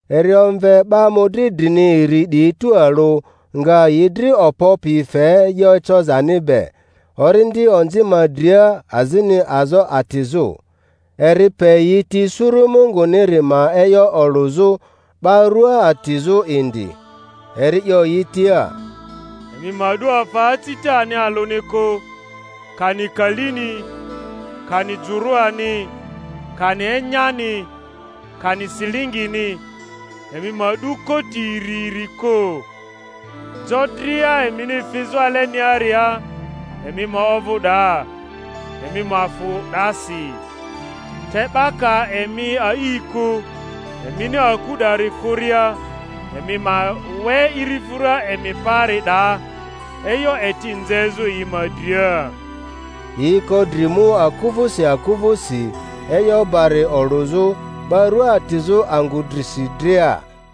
Eri omve 'ba mᴜdri drini iri 'diyi tualᴜ, nga yi dri okpo pi fe e'yo ecozani be, orindi onzi ma dria azini azo atizᴜ. Eri pe yi ti suru Munguniri ma e'yo olᴜzᴜ, 'ba rua atizᴜ indi. Eri 'yo yi tia, Emi ma 'du afa acitani alᴜni kᴜ, kani kalini, kani jᴜrᴜani, kani enyani, kani silingini; emi ma 'du koti iri iri kᴜ. Jo dria emini fizᴜ aleniaria emi ma ovᴜ 'daa, emi ma fᴜ 'dasi. Te 'ba ka emi a'i kᴜ, emini aku 'dari kᴜria emi ma we irifᴜra emi paari 'daa, e'yo eti nzezᴜ yi ma dria. Yi ko dri mu aku vᴜsi aku vᴜsi, e'yo bari olᴜzᴜ, 'ba rua atizᴜ angᴜ drisi dria.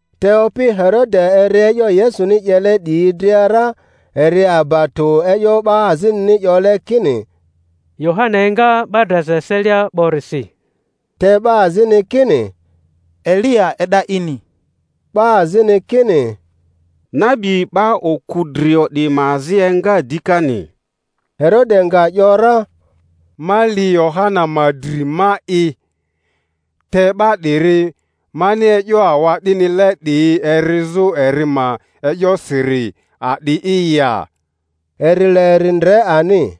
Te opi Herode eri e'yo Yesuni 'yele 'diyi dria ra, eri aba tᴜ e'yo 'ba azinini 'yole kini Yohana enga 'ba draza eselia 'borisi, te 'ba azini kini Eliya e'da ini, 'ba azini kini nabi 'ba oku drio 'diyi ma azi enga dikani. Herode nga ‘yora, Ma li Yohana ma dri ma'i; te 'ba 'diri mani e'yo awa'dinile 'diyi erizᴜ eri ma e'yosiri a'di'i ya? Eri le eri ndre ani.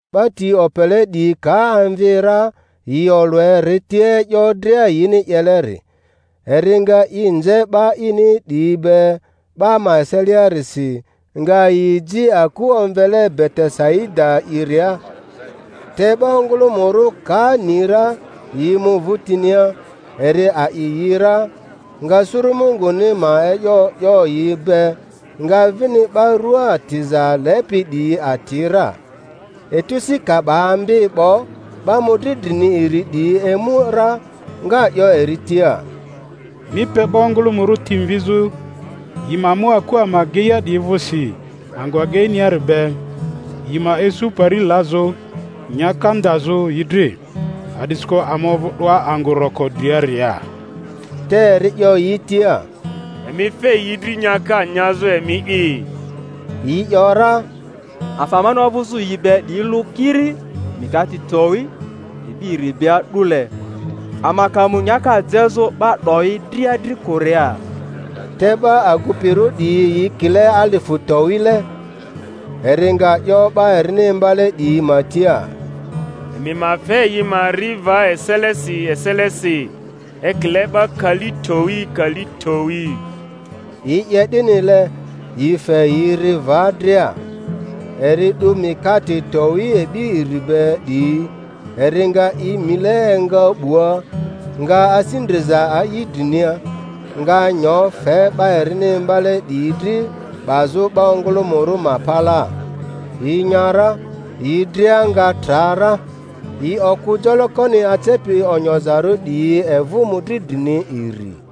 'Ba ti opele 'diyi ka emvi ra, yi olᴜ eri tia e'yo dria yini 'yeleri. Eri nga i nze 'ba ini 'diyi be 'ba ma eseliarisi, nga yi ji aku omvele Betesaida'iria. Te 'ba ongᴜlᴜmᴜrᴜ ka ni ra, yi mu vᴜtinia; eri a'i yi ra, nga suru Munguni ma e'yo 'yo yi be, nga vini 'ba rua atiza lepi 'diyi ati ra. Etu si ka 'ba ambi 'bo, 'ba mᴜdri drini iri 'diyi emu ra, nga 'yo eri tia, Mi pe 'ba ongᴜlᴜmᴜrᴜ ti mvizᴜ, yi ma mu aku ama ageia 'diyi vᴜsi angᴜ ageiniari be, yi ma isu pari lazᴜ, nyaka ndazᴜ yi dri, a'disikᴜ ama ovu 'doa angᴜ roko driaria. Te eri 'yo yi tia, Emi fe yi dri nyaka nyazᴜ emi'i. Yi ‘yora, Afa amani ovᴜzᴜ yi be 'diyi lᴜ kiri mikate towi e'bi iri be a'dule—ama ka mu nyaka jezᴜ 'ba 'doyi dria dri kᴜria. Te 'ba agupirᴜ 'diyi yi kile alifᴜ towile. Eri nga 'yo 'ba erini imbale 'diyi ma tia, Emi ma fe yi ma ri va eselesi eselesi, ekile 'ba kali towi kali towi. Yi 'ye 'dinile, yi fe yi ri va dria. Eri 'du mikate towi e'bi iri be 'diyi, eri nga i mile enga 'bua, nga asi ndriza a'i drinia, nga nyo fe 'ba erini imbale 'diyi dri 'bazᴜ 'ba ongᴜlᴜmᴜrᴜ ma palaa. Yi nya ra, yi dria nga tra ra. Yi okᴜ jolokoni acepi onyozarᴜ 'diyi evᴜ mᴜdri drini iri.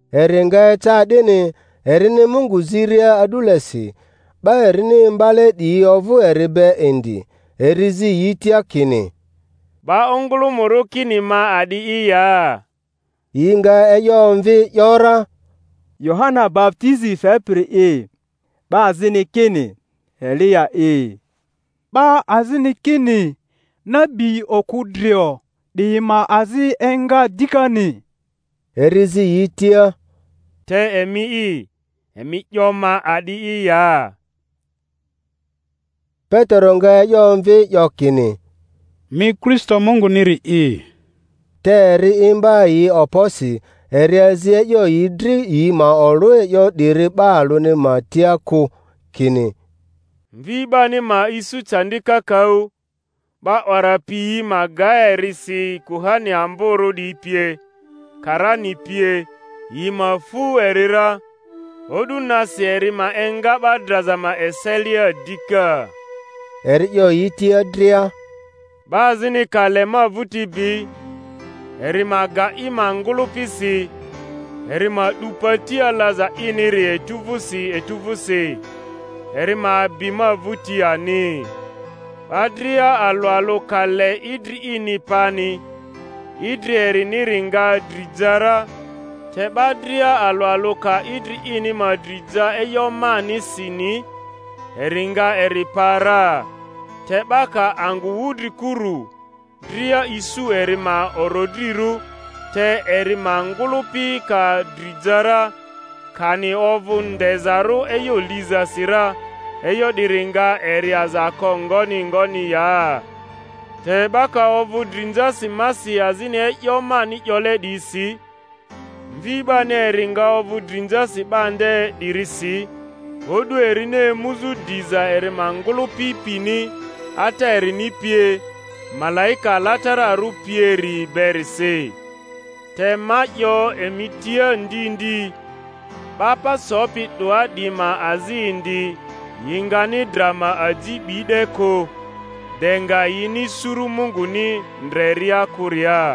Eri nga eca 'dini, erini Mungu ziria a'dulesi, 'ba erini imbale 'diyi ovᴜ eri be indi; eri zi yi tia kini, 'Ba ongᴜlᴜmᴜrᴜ kini ma a'di'i ya? Yi nga e'yo omvi, ‘yora, Yohana baputizi fepiri'i; 'ba azini kini, Eliya'i; 'ba azini kini nabi oku drio 'diyi ma azi enga dikani. Eri zi yi tia, Te emi'i, emi 'yo ma a'di'i ya? Petero nga e'yo omvi, 'yo kini, Mi Kristo Munguniri'i. Te eri imba yi okposi, eri azi e'yo yi dri yi ma olᴜ e'yo 'diri 'ba alᴜni ma tia kᴜ, kini, Mvi 'bani ma isu candi kakaᴜ, 'ba 'wara piyi ma ga eri si kuhani amborᴜ 'diyi pie, karani pie, yi ma fu eri ra, o'du nasi eri ma enga 'ba draza ma eselia dika. Eri 'yo yi tia dria, Ba azini ka le ma vᴜti bi, eri ma ga i ma ngᴜlᴜpi si, eri ma 'du pati alaza iniri etu vᴜsi etu vᴜsi, eri ma bi ma vᴜti ani. 'Ba dria alᴜ alᴜ ka le idri ini pani, idri eriniri nga dri ja ra; te 'ba dria alᴜ alᴜ ka idri ini ma dri ja e'yo manisini, eri nga eri pa ra. Te 'ba ka angᴜ wudrikuru dria isu eri ma orodrirᴜ, te eri ma ngᴜlᴜpi ka dri ja ra, kani ovᴜ ndezarᴜ e'yo lizasi ra, e'yo 'diri nga eri aza ko ngoni ngoni ya? Te 'ba ka ovᴜ drinzasi masi azini e'yo mani 'yole 'diyisi, Mvi 'bani eri nga ovᴜ drinzasi 'ba nde 'dirisi o'du erini emuzᴜ diza eri ma ngᴜlᴜpi pini, Ata erini pie, malaika alatararᴜ pieri berisi. Te ma 'yo emi tia ndi ndi, 'ba pa sopi 'doa 'diyi ma azi indi, yi ngani dra ma aji 'bi 'de kᴜ, de nga yini suru Munguni ndreria kᴜria.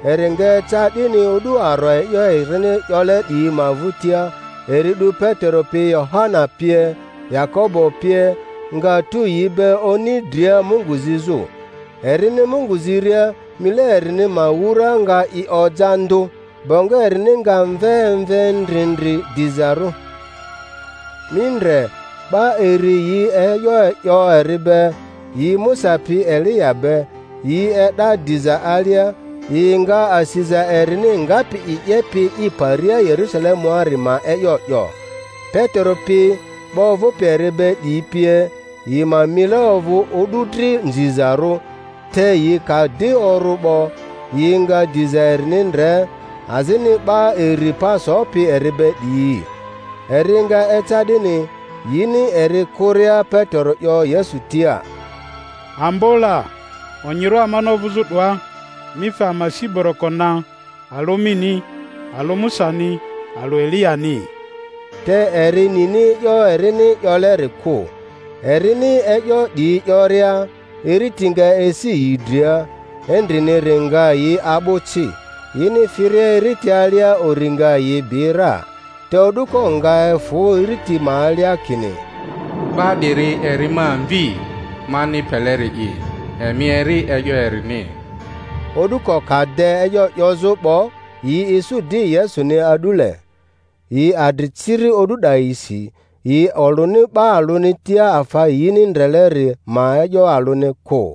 Eri nga eca 'dini o'du aro e'yo erini 'yole 'diyi ma vᴜtia, eri 'du Petero pi, Yohana pie, Yakobo pie, nga tu yi be oni dria Mungu zizᴜ. Erini Mungu ziria mile erini ma wura nga i oja ndᴜ, bongo erini nga mve emve ndrindri dizarᴜ. Mi ndre, 'ba iri yi e'yo 'yo eri be, yi Musa pi Eliya be; yi e'da diza alia, yi nga asiza erini ngapi i 'yepi i paria Yerusalemuari ma e'yo 'yo. Petero pi, 'ba ovᴜpi eri be 'diyi pie, yi ma mile ovᴜ o'du dri nzizarᴜ, te yi ka di orᴜ 'bo, yi nga diza erini ndre, azini 'ba iri pa sopi eri be 'diyi. Eri nga eca 'dini, yini eri kᴜria Petero 'yo Yesu tia, Ambo la, onyirᴜ amani ovᴜzᴜ 'doa; mi fe ama si boroko na, alᴜ mini, alᴜ Musani, alᴜ Eliyani —te eri nini e'yo erini 'yoleri kᴜ. Erini e'yo 'diyi 'yoria, iriti nga esi yi dria, endriniri nga yi a'bᴜ ci; yini firia iriti alia uri nga yi bi ra. Te o'duko nga efᴜ iriti ma alia kini, 'Ba 'diri eri ma Mvi, mani peleri'i; emi eri e'yo erini! O'duko ka de e'yo 'yozᴜ 'bo, yi isu di Yesuni a'dule. Yi adri ciri o'du 'dayisi, yi olᴜni 'ba alᴜni tia afa yini ndreleri ma e'yo alᴜni kᴜ.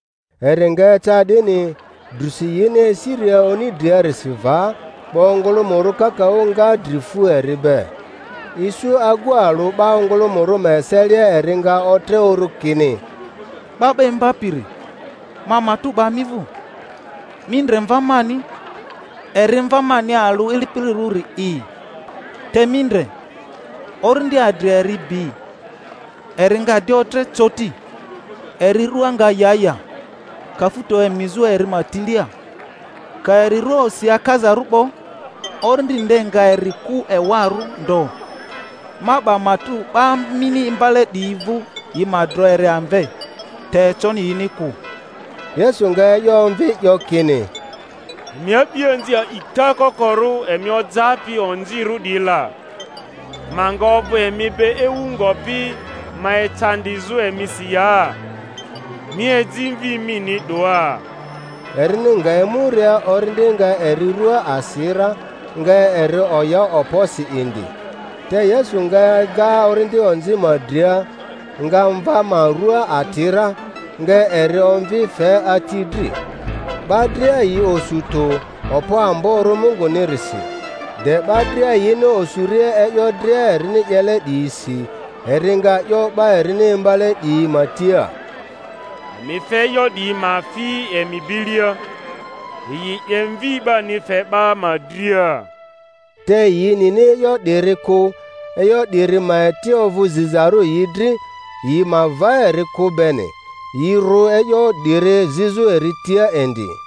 Eri nga eca 'dini, drusi yini esiria oni driarisi va, 'ba ongᴜlᴜmᴜrᴜ kakaᴜ nga dri fu eri be. Isu agu alᴜ 'ba ongᴜlᴜmᴜrᴜ ma eselia eri nga otre uru kini, 'Ba 'ba Imbapiri, ma matᴜ 'ba mi vᴜ, mi ndre mva mani, eri mva mani alᴜ ilipilirᴜrili'i te mi ndre, orindi adri eri bi, eri nga di otre coti; eri rᴜa nga ya ya, kafuto emizᴜ eri ma tilia, ka eri rua osi akazarᴜ 'bo, orindi nde nga eri kᴜ ewarᴜ ndo. Ma 'ba matᴜ 'ba mini imbale 'diyi vᴜ yi ma dro eri amve, te econi yini kᴜ. Yesu nga e'yo omvi, 'yo kini, Emi a'bianzi a'ita kokorᴜ emi ojapi onzirᴜ 'diyi la, ma nga ovᴜ emi be ewu ngopi ma ecandizᴜ emisi ya? Mi eji mvi mini 'doa. Erini nga emuria, orindi nga eri rᴜa asi ra, nga eri oya okposi indi. Te Yesu nga ega orindi onzi ma dria, nga mva ma rua ati ra, nga eri omvi fe ati dri. 'Ba dria yi osu tᴜ okpo amborᴜ Mungunirisi. De 'ba dria yini osuria e'yo dria erini 'yele 'diyisi, eri nga 'yo 'ba erini imbale 'diyi ma tia, Emi fe e'yo 'diyi ma fi emi bilia; yi 'ye Mvi 'bani fe 'ba ma dria. Te yi nini e'yo 'diri kᴜ, e'yo 'diri ma eti ovᴜ zizarᴜ yi dri, yi ma va eri kᴜ beni; yi rᴜ e'yo 'diri zizᴜ eri tia indi.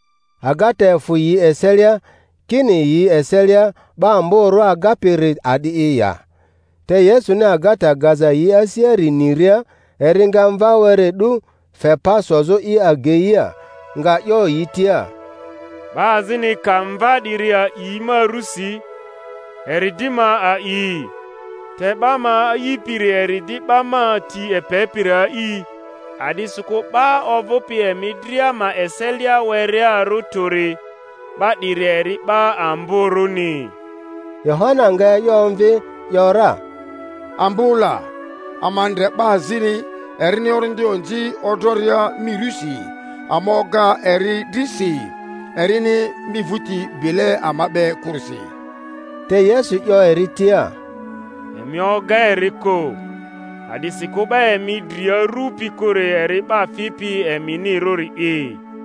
Agata efᴜ yi eselia, kini yi eselia 'ba amborᴜ agapiri a'di'i ya. Te Yesuni agata gaza yi asiari niria, eri nga mva were 'du, fe pa sozᴜ i ageia, nga 'yo yi tia, 'Ba azini ka mva 'diri a'i ma rusi, eri di ma a'i, te 'ba ma a'ipiri eri di 'ba ma ti epepiri a'i; a'disikᴜ 'ba ovᴜpi emi dria ma eselia werearᴜ tᴜri, 'ba 'diri eri 'ba amborᴜni. Yohana nga e'yo omvi, 'yo ra Ambo la, ama ndre 'ba azini erini orindi onzi odroria mi rusi; ama oga eri dri si, erini mi vᴜti bile ama be kᴜrisi. Te Yesu 'yo eri tia, Emi oga eri kᴜ; a'disikᴜ 'ba emi dri arupi kᴜri eri 'ba fipi eminirᴜri'i.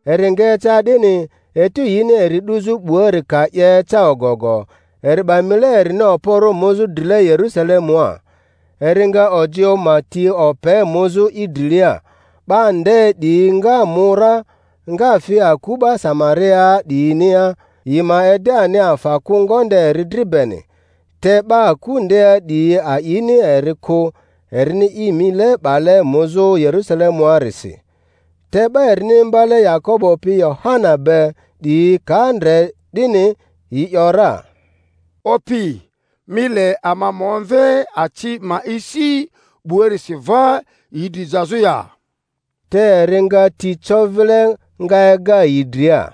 Eri nga eca 'dini, etu yini eri 'duzᴜ 'buari ka 'ye eca ogogo, eri 'ba mile erini okporᴜ muzᴜ drile Yerusalemua. Eri nga ojioᴜ ma ti ope muzᴜ i drilia; 'ba nde 'diyi nga mu ra, nga fi aku 'ba Samariaa 'diyinia, yi ma ede ani afa kᴜ ngonde eri dri beni; te 'ba aku ndea 'diyi a'ini eri kᴜ, erini i mile 'bale muzᴜ Yerusalemuarisi. Te 'ba erini imbale Yakobo pi Yohana be 'diyi ka ndre 'dini, yi ‘yora, Opi, mi le ama ma omve aci ma esi 'buarisi va yi dri jazᴜ ya? Te eri nga ti co vile, nga ega yi dria.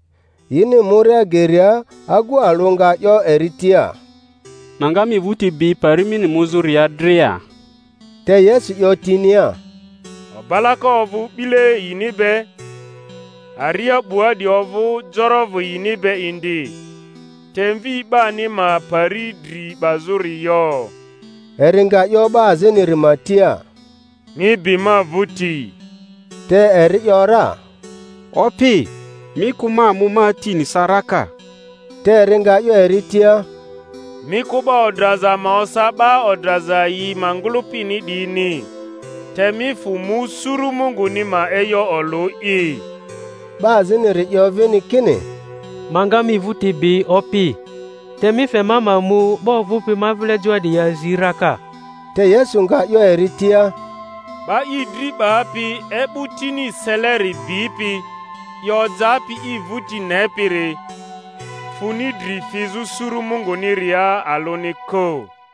Yini muria geria, agu alᴜ nga 'yo eri tia, Ma nga mi vᴜti bi pari mini muzᴜria dria. Te Yesu 'yo tinia, Obalako ovᴜ 'bile yini be, aria 'bua 'diyi ovᴜ jorovᴜ yini be indi; te Mvi 'bani ma pari dri 'bazᴜri yo. Eri nga 'yo 'ba aziniri ma tia, Mi bi ma vᴜti. Te eri ‘yora, Opi, mi kᴜ ma mu ma atini sa raka. Te eri nga 'yo eri tia, Mi kᴜ 'ba odraza ma osa 'ba odraza yi ma ngᴜlᴜpini 'diyini; te mi fᴜ mu suru Munguni ma e'yo olᴜ'i. 'Ba aziniri 'yo vini kini, Ma nga mi vᴜti bi, Opi; te mi fe ma ma mu 'ba ovᴜpi ma vile joa 'diyi azi raka. Te Yesu nga 'yo eri tia, 'Ba i dri 'bapi e'bᴜ tini seleri bipi, i ojapi i vᴜti nepiri, funi dri fizᴜ suru Munguniria alᴜni kᴜ.